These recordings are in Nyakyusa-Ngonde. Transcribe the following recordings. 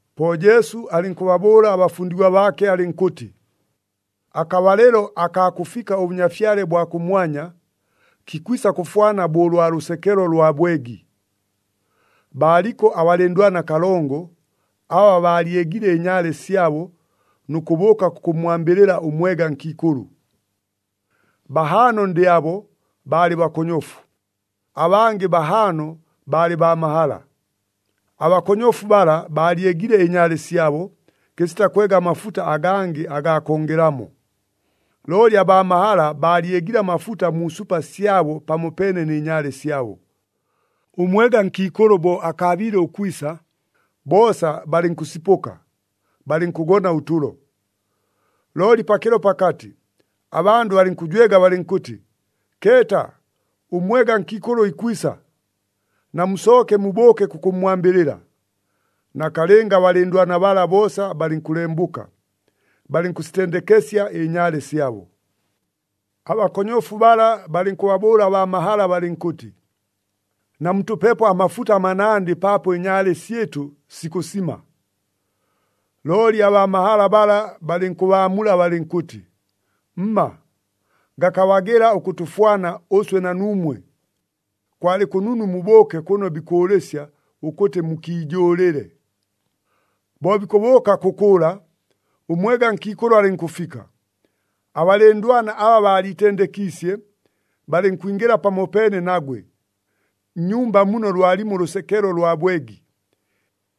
Po Jesu alɨnkʉbabʉʉla abafundigwa baake alɨnkʉtɨ, “Akabalɨlo akaa kʉfika ʉBʉnyafyale bwa kʉmwanya, kikwisa kʉfwana bo ʉlwa lʉsekelo lwa bwegi. Baaliko abalɨndwana kalongo, aba baalyegile ɨnyaale syabo nʉ kʉbʉʉka kʉkʉmmwambɨlɨla ʉmwega nkiikʉlʉ. Bahaano ndɨ abo, baalɨ bakonyofu, abangɨ bahaano baalɨ baa mahala. Abakonyofu bala baalyegile ɨnyaale syabo, kɨsita kwega amafuta agangɨ agaa kongelelamo. Looli abaa mahala baalyegile amafuta mu supa syabo pamopeene nɨ nyaale syabo. Ʉmwega nkiikʉlʉ bo akaabiile ʉkwisa, boosa balɨnkʉsipʉka, balɨnkʉgona ʉtʉlo. Looli pakɨlo pakatɨ, abandʉ balɨnkʉjwega balɨnkʉtɨ, ‘Keeta, ʉmwega nkiikʉlʉ ikwisa! Namusooke mubʉʉke kʉkʉmmwambɨlɨla.’ Nakalɨnga abalɨndwana bala boosa balɨnkʉlembʉka, balɨnkʉsitendekesya ɨnyaale syabo. “Abakonyofu bala balɨnkʉbabʉʉla abaa mahala balɨnkʉtɨ, ‘Namutʉpepo amafuta manandɨ paapo ɨnyaale syɨtʉ sikʉsima.’ Looli abaa mahala bala balɨnkʉbaamula balɨnkʉtɨ, ‘Mma! Gakabagɨla ʉkʉtʉfwana ʉswe na nuumwe. Kwalɨ kʉnunu mubʉʉke kʉno bikʉʉlɨsya ʉkʉtɨ mukiijʉʉlɨle.’ “Bo bikʉbʉʉka kʉkʉʉla, ʉmwega nkiikʉlʉ alɨnkʉfika, abalɨndwana aba baaliitendekiisye, balɨnkwingɨla pamopeene nagwe nnyumba muno lwalimo ʉlʉsekelo lwa bwegi,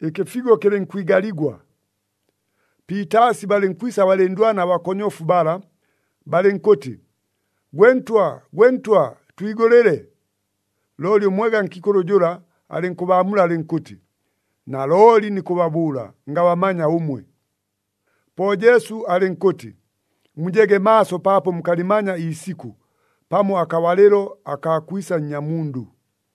ɨkɨfigo kɨlɨnkwigaligwa. Piitaasi balɨnkwisa abalɨndwana abakonyofu bala, balɨnkʉtɨ, ‘Gwe ntwa! Gwe ntwa! Twigʉlɨle!’ Looli ʉmwega nkiikʉlʉ jʉla alɨnkʉbaamula alɨnkʉtɨ, ‘Nalooli nikʉbabʉʉla, ngabamanya ʉmwe!’” Po Jesu alɨnkʉtɨ, “Mujege maaso paapo mukalɨmanya iisikʉ, pamo akabalɨlo akaa kwisa Nnyamundʉ.”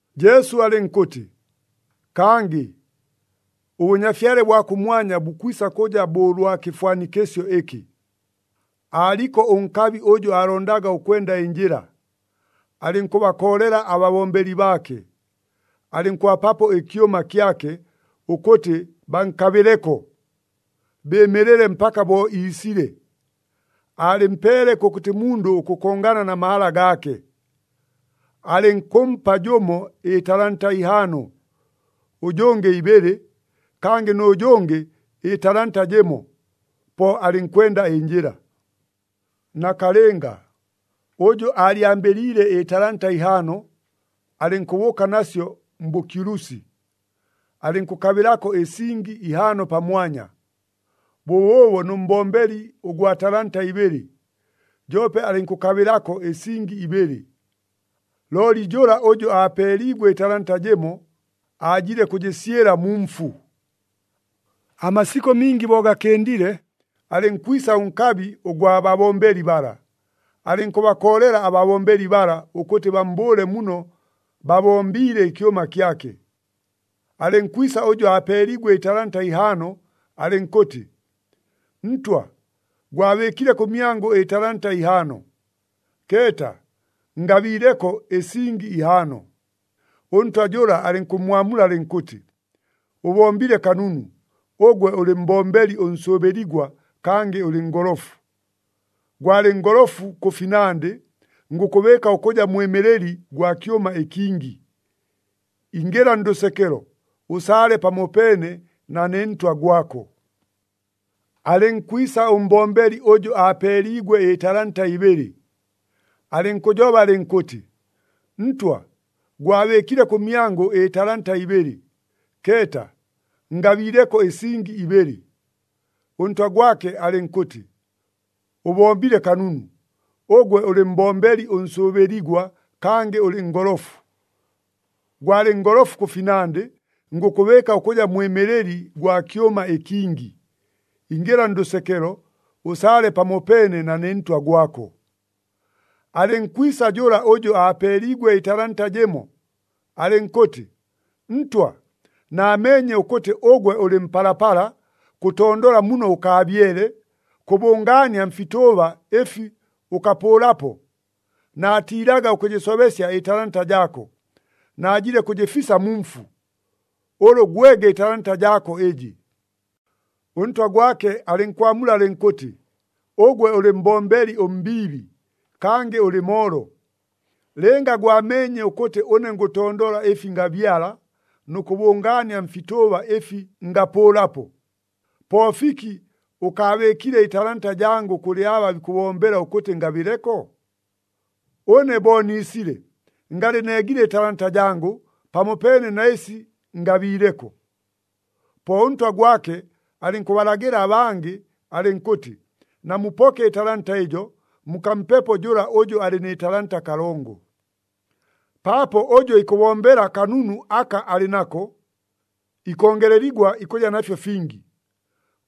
Jesu alɨnkʉtɨ, “Kangɨ ʉBʉnyafyale bwa kʉmwanya bukwisa kʉja bo ʉlwa kɨfwanikɨsyo ɨkɨ. Aaliko ʉnkabi ʉjʉ aalondaga ʉkwenda ɨnjɨla, alɨnkʉbakoolela ababombeli baake, alɨnkʉbapapo ɨkyʉma kyake, ʉkʉtɨ bankabɨleko, bɨɨmɨlɨle mpaka bo iisile. Aalɨmpeele kʉkʉtɨ mundʉ ʉkʉkongana na mahala gaake. Alɨnkʉmpa jʉmo ɨtalanta ihaano, ʉjʉngɨ ibɨlɨ, kangɨ nʉ jʉngɨ ɨtalanta jɨmo, po alɨnkwenda ɨnjɨla. “Nakalɨnga, ʉjʉ aalyambɨliile ɨtalanta ihaano, alɨnkʉbʉʉka nasyo mbʉkyulusi, alɨnkʉkabɨlako ɨsingi ihaano pamwanya. Bʉbʉʉbo nʉ mbombeli ʉgwa talanta ibɨlɨ, joope alɨnkʉkabɨlako ɨsingi ibɨlɨ. Looli jʉla ʉjʉ aapeeliigwe ɨtalanta jɨmo, aajile kʉjɨsyɨla mu mfu. “Amasikʉ mingi bo gakɨndile, alɨnkwisa ʉnkabi ʉgwa babombeli bala, alɨnkʉbakoolela ababombeli bala ʉkʉtɨ bammbʉʉle muno babombiile ɨkyʉma kyake. Alɨnkwisa ʉjʉ aapeeliigwe ɨtalanta ihaano, alɨnkʉtɨ, ‘Ntwa, gwabɨɨkile kʉmyangʉ ɨtalanta ihaano. Keeta, ngabiileko ɨsingi ihaano.’ Ʉntwa jʉla alɨnkʉmmwamula alɨnkʉtɨ, ‘Ʉbombile kanunu, ʉgwe ʉlɨ mbombeli ʉnsʉʉbɨligwa kangɨ ʉlɨ ngolofu. Gwalɨ ngolofu kʉ finandɨ, ngʉkʉbɨɨka ʉkʉja mwɨmɨlɨli gwa kyʉma ɨkingi. Ingɨla ndʉsekelo, ʉsaale pamopeene na ne ntwa gwako.’ “Alɨnkwisa ʉmbombeli ʉjʉ aapeeliigwe ɨtalanta ibɨlɨ, alɨnkʉjoba alɨnkʉtɨ, ‘Ntwa, gwabɨɨkile kʉmyangʉ ɨtalanta ibɨlɨ. Keeta, ngabiileko ɨsingi ibɨlɨ.’ Ʉntwa gwake alɨnkʉtɨ, ‘Ʉbombile kanunu, ʉgwe ʉlɨ mbombeli ʉnsʉʉbɨligwa kangɨ ʉlɨ ngolofu. Gwalɨ ngolofu kʉ finandɨ, ngʉkʉbɨɨka ʉkʉja mwɨmɨlɨli gwa kyʉma ɨkingi. Ingɨla ndʉsekelo, ʉsaale pamopeene na ne ntwa gwako.’ “Alɨnkwisa jʉla ʉjʉ aapeeliigwe ɨtalanta jɨmo, alɨnkʉtɨ, ‘Ntwa, naameenye ʉkʉtɨ ʉgwe ʉlɨ mpalapala, kʉtondola muno ʉkaabyele, kʉbʉngaania mfitʉʉba ɨfi ʉkapʉʉlapo. Naatiilaga ʉkʉjɨsobesya ɨtalanta jaako, najile kʉjɨfisa mu mfu. Ʉlʉ gwege ɨtalanta jaako ɨjɨ.’ “Ʉntwa gwake alɨnkwamula alɨnkʉtɨ, ‘Ʉgwe ʉlɨ mbombeli ʉmbiibi, kangɨ ʉlɨ moolo! Lɨnga gwameenye ʉkʉtɨ ʉne ngʉtondola ɨfi ngabyala nʉ kʉbʉngaania mfitʉʉba ɨfi ngapʉʉlapo, po fiki ʉkaabɨɨkile ɨtalanta jangʉ kʉlɨ aba bikʉbombela ʉkʉtɨ ngabɨleko? Ʉne bo niisile, ngalɨ neegile ɨtalanta jangʉ, pamopeene na ɨsi ngabiileko.’ Po ʉntwa gwake alɨnkʉbalagɨla abangɨ alɨnkʉtɨ, ‘Namupoke ɨtalanta ɨjo, mukampepo jʉla ʉjʉ alɨ nɨ talanta kalongo.’ “Paapo ʉjʉ ikʉbombela kanunu aka alɨ nako, ikongeleligwa ikʉja nafyo fingi.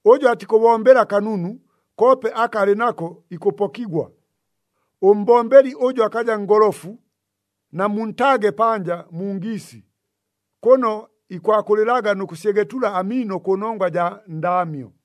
Ʉjʉ atikʉbombela kanunu, koope aka alɨ nako ikʉpokigwa. Ʉmbombeli ʉjʉ akaja ngolofu, namuntaage panja mu ngiisi, kʉno ikwakʉlɨlaga nʉ kʉsyegetula amiino kʉnongwa jaa ndaamyo.”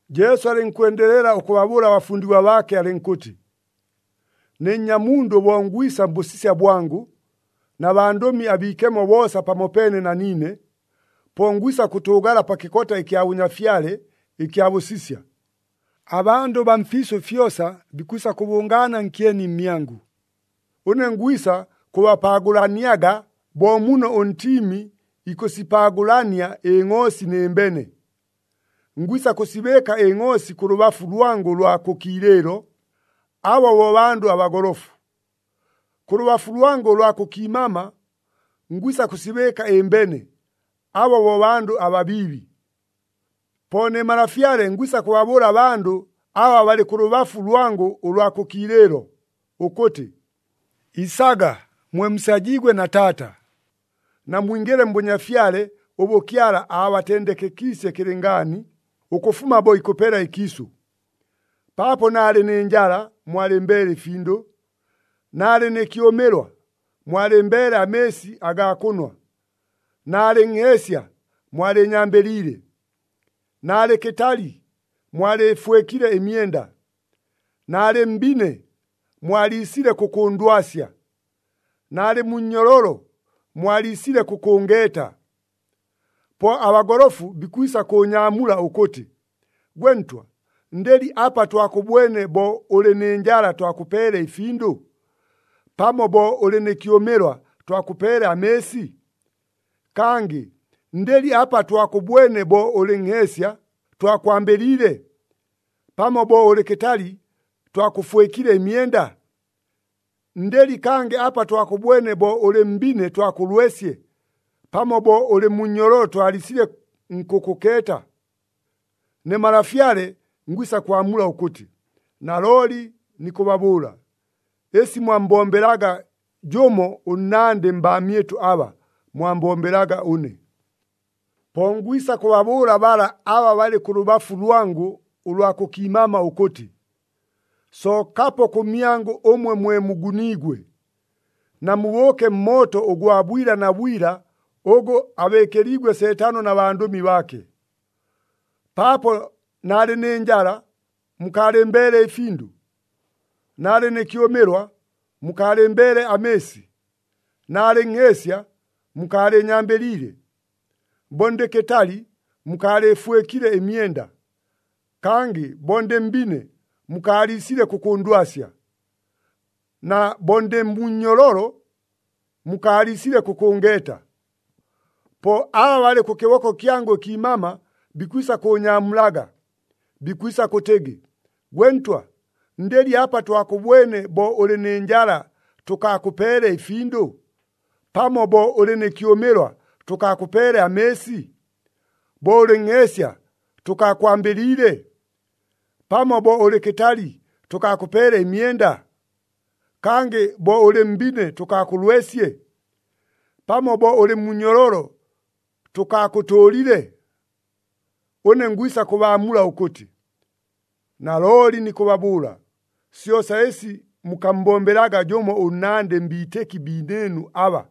Jesu alɨnkwendelela ʉkʉbabʉʉla abafundigwa baake alɨnkʉtɨ, “Ne Nnyamundʉ bo ngwisa mbʉsisya bwangʉ, na bandʉmi abiikemo boosa pamopeene na niine, po ngwisa kʉtʉʉgala pa kɨkota ɨkya bʉnyafyale, ɨkya bʉsisya. Abandʉ baa mfiisʉ fyosa bikwisa kʉbʉngaana nkyeni mmyangʉ. Ʉne ngwisa kʉbapaagʉlaniaga bo muno ʉntiimi ikʉsipaagʉlania ɨngʼoosi nɨ mbene. Ngwisa kʉsibɨɨka ɨngʼoosi kʉ lʉbafu lwangʉ ʉlwa kʉ kiilɨɨlo, aba bo bandʉ abagolofu. Kʉ lʉbafu lwangʉ ʉlwa kʉ kiimama ngwisa kʉsibɨɨka ɨmbene, aba bo bandʉ ababiibi. “Po ne Malafyale ngwisa kʉbabʉʉla abandʉ aba balɨ kʉ lʉbafu lwangʉ ʉlwa kʉ kiilɨɨlo, ʉkʉtɨ, ‘Isaga, mwe musajiigwe na Taata. Namwingɨle mbʉnyafyale ʉbʉ Kyala aabatendekekiisye kɨlɨngaani, ʉkʉfuma bo ikʉpela ɨkiisʉ. Paapo naalɨ nɨ njala, mwalɨmbeele ɨfindʉ. Naalɨ nɨ kyʉmɨlwa, mwalɨmbeele amɨɨsi agaa kʉnwa. Naalɨ nheesya, mwalɨɨnyambɨliile. Naalɨ kɨtali, mwalɨɨfwɨkile ɨmyenda. Naalɨ mbine, mwaliisile kʉkʉʉndwasya. Naalɨ mu nnyololo, mwaliisile kʉkʉngeeta.’ Po abagolofu bikwisa kʉʉnyaamula ʉkʉtɨ, ‘Gwe Ntwa, ndɨli apa twakʉbwene bo ʉlɨ nɨ njala twakʉpeele ɨfindʉ? Pamo bo ʉlɨ nɨ kyʉmɨlwa twakʉpeele amɨɨsi? Kangɨ ndɨli apa twakʉbwene bo ʉlɨ nheesya twakwambɨliile? Pamo bo ʉlɨ kɨtali twakʉfwɨkile ɨmyenda? Ndɨli kangɨ apa twakʉbwene bo ʉlɨ mbine twakʉlwesye, pamo bo ʉlɨ mu nnyololo twaliisile nkʉkʉkeeta?’ Ne Malafyale ngwisa kwamula ʉkʉtɨ, ‘Nalooli nikʉbabʉʉla, ɨsi mwammbombelaga jʉmo ʉnnandɨ mbaamyɨtʉ aba, mwambombelaga ʉne.’ “Po ngwisa kʉbabʉʉla bala aba balɨ kʉ lʉbafu lwangʉ ʉlwa kʉ kiimama ʉkʉtɨ, ‘Sookapo kʉmyangʉ ʉmwe mwe muguniigwe, namubʉʉke mmooto ʉgwa bwila na bwila ʉgʉ abɨɨkɨliigwe Seetano na bandʉmi baake. Paapo naalɨ nɨ njala, mukaalɨmbeele ɨfindʉ. Naalɨ nɨ kyʉmɨlwa, mukaalɨmbeele amɨɨsi. Naalɨ nheesya, mukaalɨɨnyambɨliile. Bo ndɨ kɨtali, mukaalɨɨfwɨkile ɨmyenda. Kangɨ bo ndɨ mbine, mukaaliisile kʉkʉʉndwasya. Na bo ndɨ mu nnyololo, mukaaliisile kʉkʉngeeta.’ Po aba balɨ kʉ kɨboko kyangʉ ɨkiimama bikwisa kʉʉnyaamulaga, bikwisa kʉtɨgɨ, ‘Gwe Ntwa, ndɨli apa twakʉbwene bo ʉlɨ nɨ njala tʉkaakʉpeele ɨfindʉ? Pamo bo ʉlɨ nɨ kyʉmɨlwa tʉkaakʉpeele amɨɨsi? Bo ʉlɨ nheesya tʉkaakwambɨliile? Pamo bo ʉlɨ kɨtali tʉkaakʉpeele ɨmyenda? Kangɨ bo ʉlɨ mbine tʉkaakʉlwesye? Pamo bo ʉlɨ mu nnyololo tʉkaakʉtʉʉlile?’ Ʉne ngwisa kʉbaamula ʉkʉtɨ, ‘Nalooli nikʉbabʉʉla, syosa ɨsi mukammbombelaga jʉmo ʉnnandɨ mbiitɨki biinɨɨnu aba,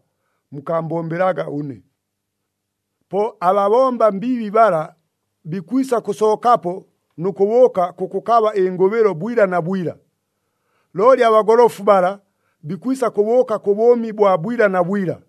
mukaambombelaga ʉne.’ “Po ababomba mbiibi bala bikwisa kʉsookapo nʉ kʉbʉʉka kʉkʉkaba ɨngʉbɨlo bwila na bwila. Looli abagolofu bala bikwisa kʉbʉʉka kʉ bʉʉmi bwa bwila na bwila.”